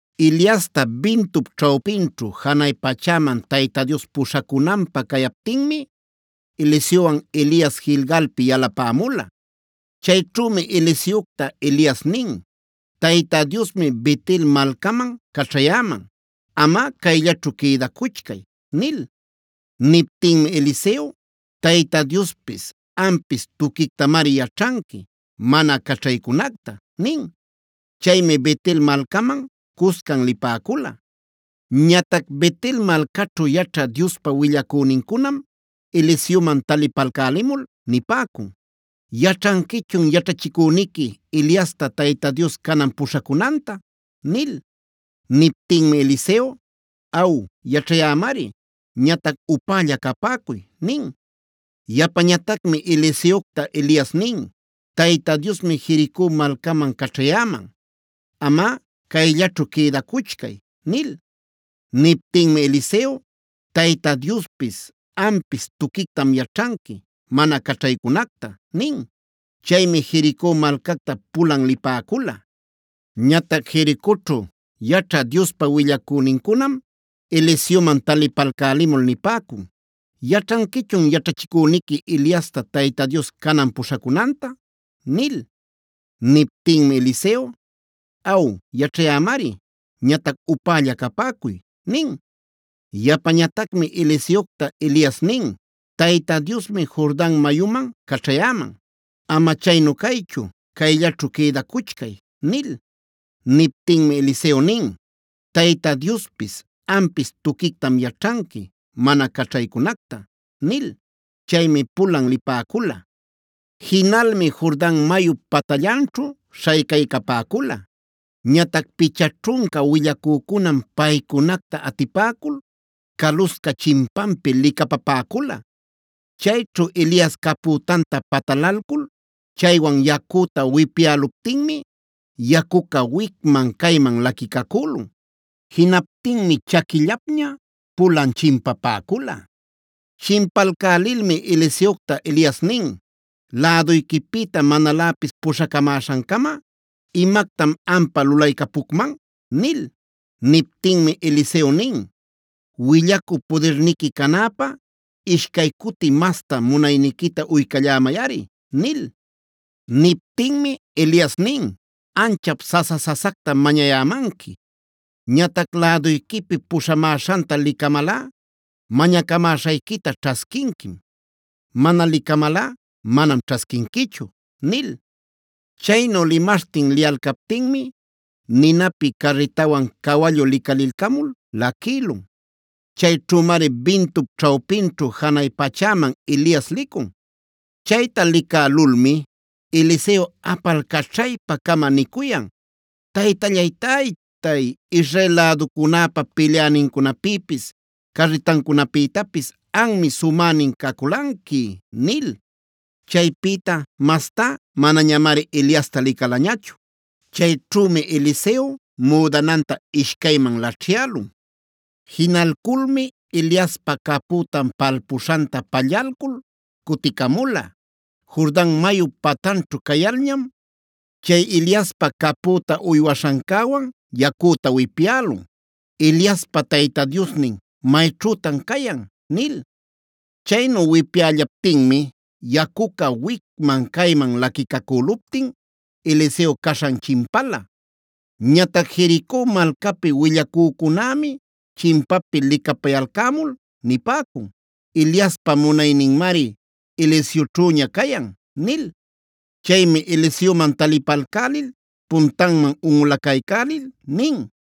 Eliasta bintup ćhawpinćhu janay pachäman Tayta Dios puśhacunanpä cayaptinmi Eliseowan Elias Gilgalpi yalapämula. Chayćhümi Eliseocta Elias nin: Tayta Diosmi Bet-el malcaman caćhayäman. Amꞌa cayllaćhu quïdacuchcay” nil. Niptinmi Eliseo: Tayta Diospis ampis tuquictamari yaćhanqui mana caćhaycunacta” nin. Chaymi Bet-el malcaman cuscan lipäcula. Ñatac Bet-el malcaćhu yaćha Diospa willacünincunam Eliseoman talipalcälimul nipäcun: “¿Yaćhanquichun yaćhachïcüniqui Eliasta Tayta Dios canan puśhacunanta?” nil. Niptinmi Eliseo: “Aw, yaćhayämari. Ñatac upälla capäcuy” nin. Yapañatacmi Eliseocta Elias nin: Tayta Diosmi Jerico malcaman caćhayäman. Amꞌa cayllaćhu quïdacuchcay” nil. Niptinmi Eliseo: Tayta Diospis ampis tuquictam yaćhanqui mana caćhaycunacta” nin. Chaymi Jerico malcacta pulan lipäcula. Ñatac Jericoćhu yaćhä Diospa willacünincunam Eliseoman talipalcälimul nipäcun: “¿Yaćhanquichun yaćhachïcüniqui Eliasta Tayta Dios canan puśhacunanta?” nil. Niptinmi Eliseo: “Aw, yaćhayämari. Ñatac upälla capäcuy” nin. Yapañatacmi Eliseocta Elias nin: Tayta Diosmi Jordan mayuman caćhayäman. Ama chaynu caychu cayllaćhu quïdacuchcay” nil. Niptinmi Eliseo nin: Tayta Diospis ampis tuquictam yaćhanqui mana caćhaycunacta” nil. Chaymi pulan lipäcula. Jinalmi Jordan mayup patallanćhu śhaycaycapäcula. Ñatac picha ćhunca willacücunam paycunacta atipäcul calusca chimpampi licapapäcula. Chayćhu Elias capütanta patalalcula chaywan yacüta wipyäluptinmi yacuca wicman-cayman laquicacülun. Jinaptinmi chaquillapña pulan chimpapäcula. Chimpalcälilmi Eliseocta Elias nin: “¿Läduyquipïta manaläpis puśhacamäśhancama, imactam ampä lulaycapucman?” nil. Niptinmi Eliseo nin: “Willacü pudirniqui canäpä ishcay cuti masta munayniquita uycallämayꞌari” nil. Niptinmi Elias nin: “Anchap sasa-sasactam mañayämanqui. Ñatac läduyquipi puśhamäśhanta licamalꞌa mañacamäśhayquita ćhasquinquim. Mana licamalꞌa manam ćhasquinquichu” nil. Chaynu limaśhtin liyalcaptinmi ninapi carritawan cawallu licalilcamul laquïlun. Chayćhümari bintup ćhawpinćhu janay pachäman Elias licun. Chayta licälulmi Eliseo apalcaćhaypa-cama nicuyan: “Taytallay-taytay, Israel läducunäpa pilyänincunapïpis, carritancunapïtapis anmi sumänin caculanqui” nil. Chaypïta mastá manañamari Eliasta licalañachu. Chayćhümi Eliseo müdananta ishcayman laćhyälun. Jinalculmi Eliaspa capütan palpuśhanta pallalcul cuticamula. Jordan mayup patanćhu cayalñam, chay Eliaspa capüta uywaśhancäwan yacüta wipyälun: “Eliaspa Tayta Diosnin, ¿mayćhütan cayan?” nil. Chaynu wipyällaptinmi yacuca wicman-cayman laquicacüluptin Eliseo caśhan chimpala. Ñatac Jerico malcapi willacücunämi chimpapi licapayalcämul nipäcun: “Eliaspa munayninmari Eliseoćhüña cayan” nil. Chaymi Eliseoman talipalcälil puntanman unꞌulacaycälil nin: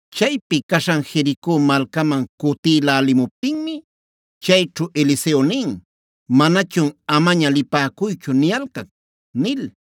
Chaypi caśhan Jerico malcaman cutïlälimuptinmi chayćhu Eliseo nin: “Manachun ‘amaña lipäcuychu’ niyalcac” nil.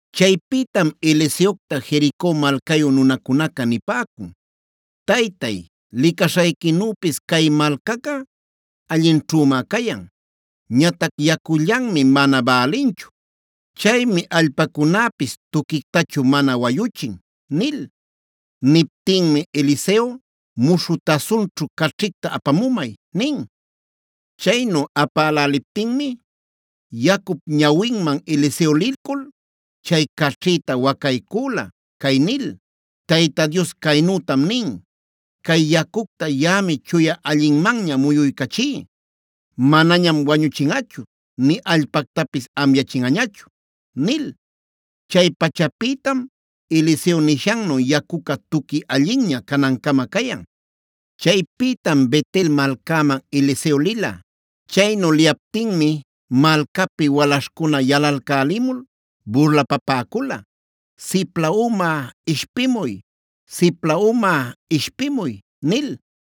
Chaypïtam Eliseocta Jerico malcayu nunacunaca nipäcun: “Taytay, licaśhayquinüpis cay malcaca allinćhümá cayan. Ñatac yacullanmi mana bälinchu. Chaymi allpacunäpis tuquictachu mana wayuchin” nil. Niptinmi Eliseo: “Muśhü tasunćhu caćhicta apamumay” nin. Chaynu apäläliptinmi, yacup ñawinman Eliseo lilcul, chay caćhïta wacaycüla cay nil: Tayta Dios caynütam nin: ‘Cay yacucta yaꞌami chuya allinmanña muyuycachí. Manañam wañuchinꞌachu nï allpactapis amyachinꞌañachu’” nil. Chay pachapïtam Eliseo nishannu yacuca tuqui allinña canancama cayan. Chaypïtam Bet-el malcäman Eliseo lila. Chaynu liyaptinmi malcapi walaśhcuna yalalcälimul burlapapäcula: “¡Sipla uma, ishpimuy! ¡Sipla uma, ishpimuy!” nil.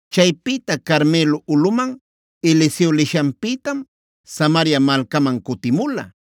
Chaypïta Carmelo ulꞌuman Eliseo lishanpïtam Samaria malcaman cutimula.